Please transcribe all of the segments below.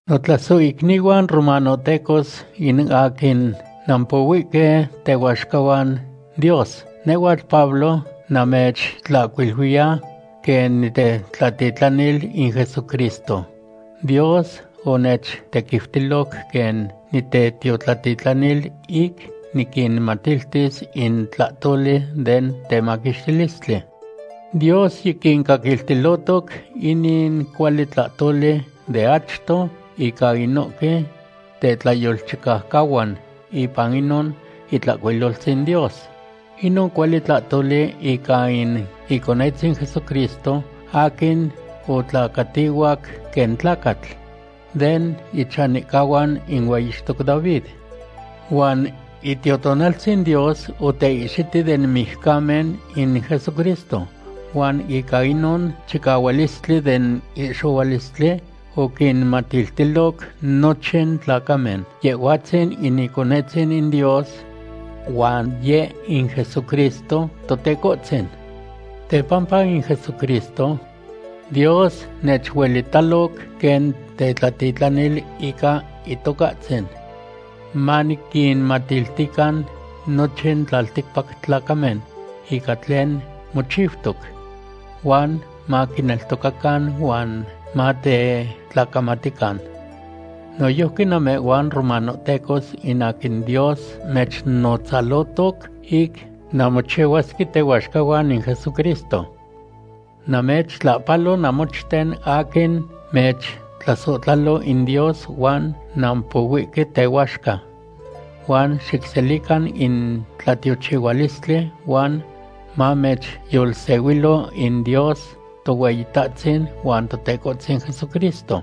Notlasohicnihuan romanohtecos in aquin nampohuihque tehuaxcahuan Dios: nehhuatl Pablo namechtlahcuiluiya, quen nitetlatitlanil in Jesucristo. Dios onechtequiutiloc quen nitetiotlatitlanil ic niquinmatiltis in tlahtoli den temaquixtilistli. Dios yiquincaquiltilohtoc inin cuali tlahtoli de achto ica inohque tetlayolchicaucahuan ipan inon Itlahcuiloltzin Dios. Inon cuali tlahtoli ica in Iconetzin Jesucristo aquin otlacatihuac quen tlacatl, den ichanihcahuan in hueyixtoc David. Huan Itiotonaltzin Dios oteihxiti den mijcamen in Jesucristo, huan ica inon chicahualistli den ihxohualistli oquinmatiltiloc nochin tlacamen Yehhuatzin in Iconetzin in Dios. Huan Yeh in Jesucristo Totecohtzin. Tepampa in Jesucristo, Dios nechuelitaloc quen tetlatitlanil ica Itocahtzin, maniquinmatiltican nochin tlalticpac tlacamen ica tlen mochiutoc, huan maquineltocacan huan matetlacamatican. Noyojqui namehhuan romanohtecos in aquin Dios mechnotzalohtoc ic nanmochihuasque tehuaxcahuan in Jesucristo. Namechtlahpalo namochten aquin mechtlasohtlalo in Dios huan nampohuihque tehuaxca. Huan xicselican in tlatiochihualistli huan mamechyolsehuilo in Dios Tohueyitahtzin huan Totecohtzin Jesucristo.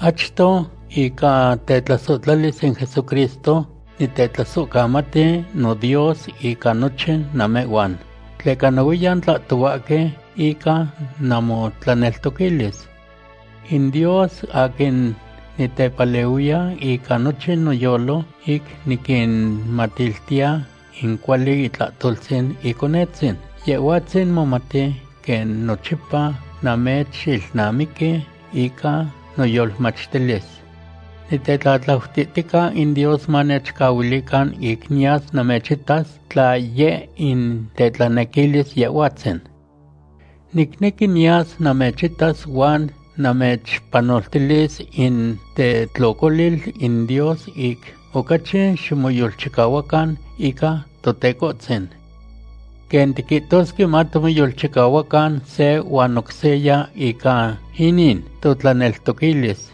Achto ica tetlasohtlalis in Jesucristo nitetlasohcamati noDios ica nochin namehhuan, tleca nohuiyan tlahtohuahque ica namotlaneltoquilis. In Dios aquin nitepalehuiya ica nochin noyolo ic niquinmatiltiya in cuali itlahtoltzin Iconetzin, Yehhuatzin momati quen nochipa namechilnamiqui ica noyolmachtilis. Nitetlatlautihtica in Dios manechcahuilican ic niyas namechitas, tla yeh in tetlanequilis Yehhuatzin. Nicnequi niyas namechitas huan namechpanoltilis in tetlocolil in Dios ic ocachi ximoyolchicahuacan ica Totecohtzin. Quen tiquihtosque, matimoyolchicahuacan se huan oc seya ica inin totlaneltoquilis,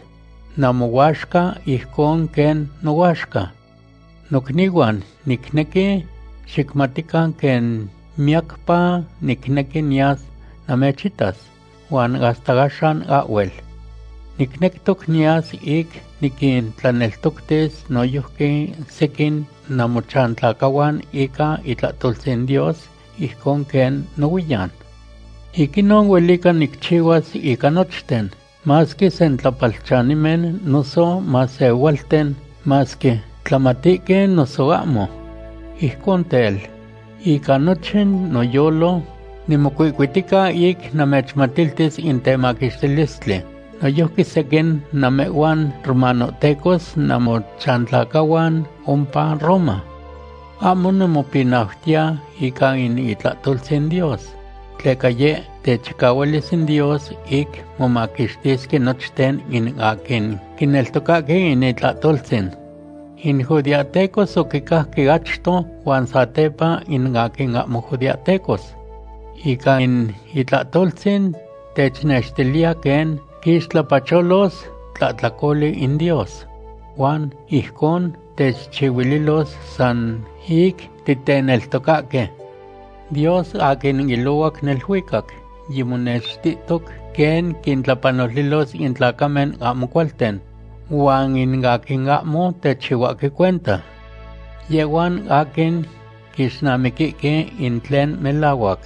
namohuaxca ijcon quen nohuaxca. Nocnihuan, nicnequi xicmatican quen miyacpa nicnequi niyas namechitas, huan hasta axan ahhuel. Nicnectoc niyas ic niquintlaneltoctis noyojqui sequin namochantlacahuan ica itlahtoltzin Dios, ijcon quen nohuiyan. Ic inon huelica nicchihuas ica nochten, masque sentlapalchanimen noso masehualten; masque tlamatihque noso ahmo. Ijcon tel, ica nochin noyolo nimocuihcuitica ic namechmatiltis in temaquixtilistli noyojqui sequin namehhuan romanohtecos namochantlacahuan ompa Roma. Ahmo nimopinautiya ica in itlahtoltzin Dios, tleca yeh techicahualis in Dios ic momaquixtisque nochten in aquin quineltocahque in itlahtoltzin. In judeahtecos oquicajque achto huan satepa in aquin ahmo judeahtecos. Ica in itlahtoltzin technextiliya quen quixtlapacholos tlahtlacoli in Dios. Huan ijcon techchihuililos san ic titeneltocahque. Dios aquin ilohuac neluicac yimonextihtoc quen quintlapanoltilos in tlacamen ahmo cualten huan in aquin ahmo techihuahque cuenta. Yehhuan aquin quixnamiquihque in tlen melahuac.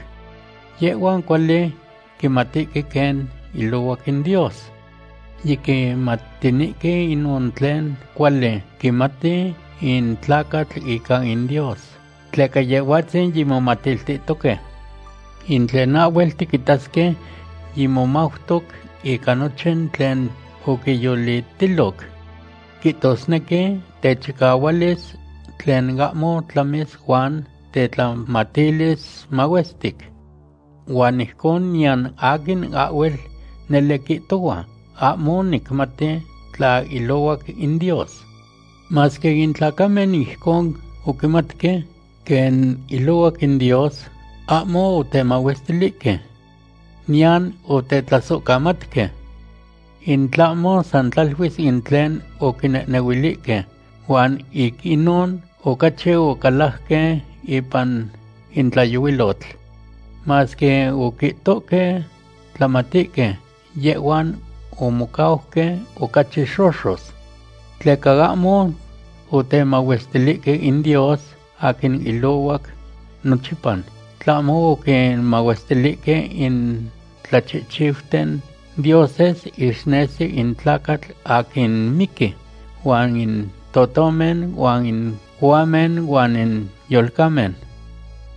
Yehhuan cuali quimatihque quen ilohuac in Dios. Yiquimatinihque inon tlen cuali quimati in tlacatl ica in Dios, tleca Yehhuatzin yimomatiltihtohque. In tlen ahhuel tiquitasque yimomautoc ica nochin tlen oquiyolitiloc. Quihtosnequi techicahualis tlen ahmo tlamis huan tetlamatilis mahuestic. Huan ijcon niyan aquin ahhuel nele quihtohua: “Ahmo nicmati tla ilohuac in Dios.” Masque in tlacamen ijcon oquimatque quen ilohuac in Dios, ahmo otemahuestilihque. Niyan otetlasohcamatque. In tlahmo san tlaluis in tlen oquinehnehuilihque, huan ic inon ocachi ocalajque ipan in tlayohuilotl. Masque oquihtohque tlamatihque, yehhuan omocauque ocachi xoxos. Tleca ahmo otemahuestilihque in Dios aquin ilohuac nochipa, tlahmo oquinmahuestilihque in tlachihchiuten dioses ixnesi in tlacatl aquin miqui, huan in totomen, huan in cohuamen, huan in yolcamen.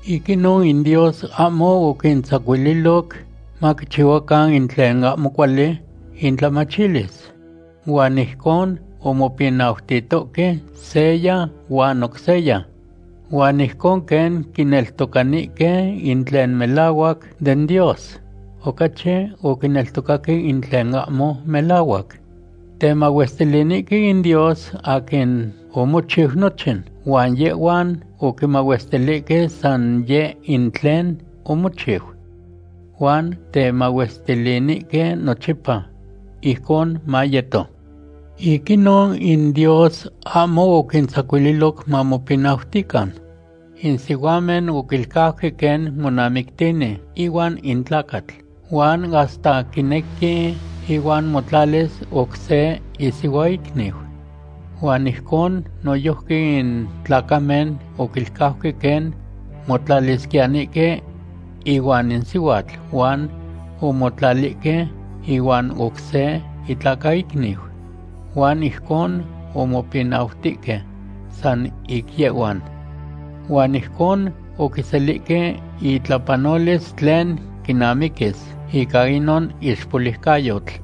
Ic inon in Dios ahmo oquintzacuililoc maquichihuacan in tlen ahmo cuali intlamachilis, huan ijcon omopinautihtoque seya huan oc seya. Huan ijcon quen quineltocanihque in tlen melahuac den Dios, ocachi oquineltocaque in tlen ahmo melahuac. Temahuestilinihque in Dios aquin omochiu nochin, huan yehhuan oquimahuestilihque san yeh in tlen omochiu. Huan temahuestilinihque nochipa. Ijcon mayeto. Ic inon in Dios ahmo oquintzacuililoc mamopinautihtocan. In sihuamen oquilcauque quen monamictini ihuan in tlacatl, huan hasta quinequi ihuan motlalis oc se isihuaicniu. Huan ijcon noyojqui in tlacamen oquilcauque quen motlalisquiyanihque ihuan in sihuatl huan omotlalihque ihuan oc se itlacaicniu, huan ijcon omopinautihque san ic yehhuan. Huan ijcon oquiselihque intlapanolis tlen quinamiquis ica inon ixpoliucayotl.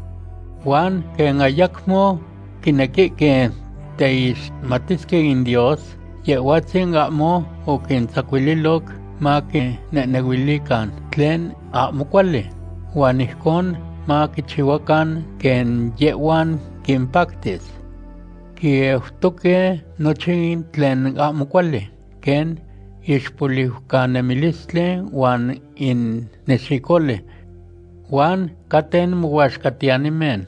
Huan quen ayacmo quinequihque teixmatisque in Dios, Yehhuatzin ahmo oquintzacuililoc maquinehnehuilican tlen ahmo cuali, huan ijcon maquichihuacan quen yehhuan quimpactis. Quieutoque nochin tlen ahmo cuali, quen ixpoliucanemilistli huan in nexicoli. Huan caten mohuaxcatiyanimen,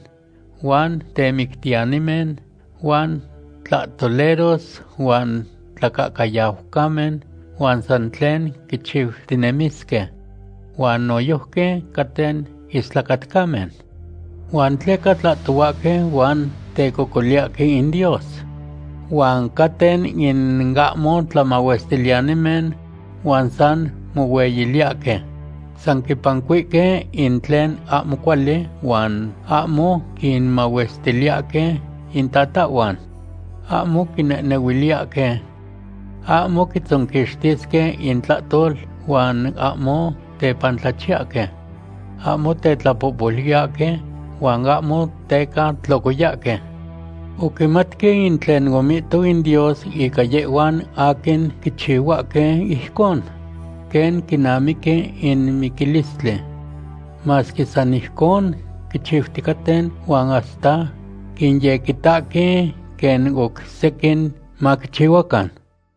huan temictiyanimen, huan tlahtoleros, huan tlacahcayaucamen, huan san tlen quichiutinemisque. Huan noyojqui caten istlacatcamen, huan teca tlahtohuahque huan tecocoliyahque in Dios. Huan caten in ahmo tlamahuestiliyanimen huan san mohueyiliyahque. San quipancuihque in tlen ahmo cuali huan ahmo quinmahuestiliyahque intatahhuan. Ahmo quinehnehuiliyahque. Ahmo quitzonquixtisque intlahtol huan ahmo tepantlachiyahque. Ahmo tetlapohpoluiyahque huan ahmo teca tlocoyahque. Oquimatque in tlen omihto in Dios ica yehhuan aquin quichihuahque ijcon, quen quinamiqui in miquilistli. Masque san ijcon quichiuticaten huan hasta quinyequitahque quen oc sequin maquichihuacan.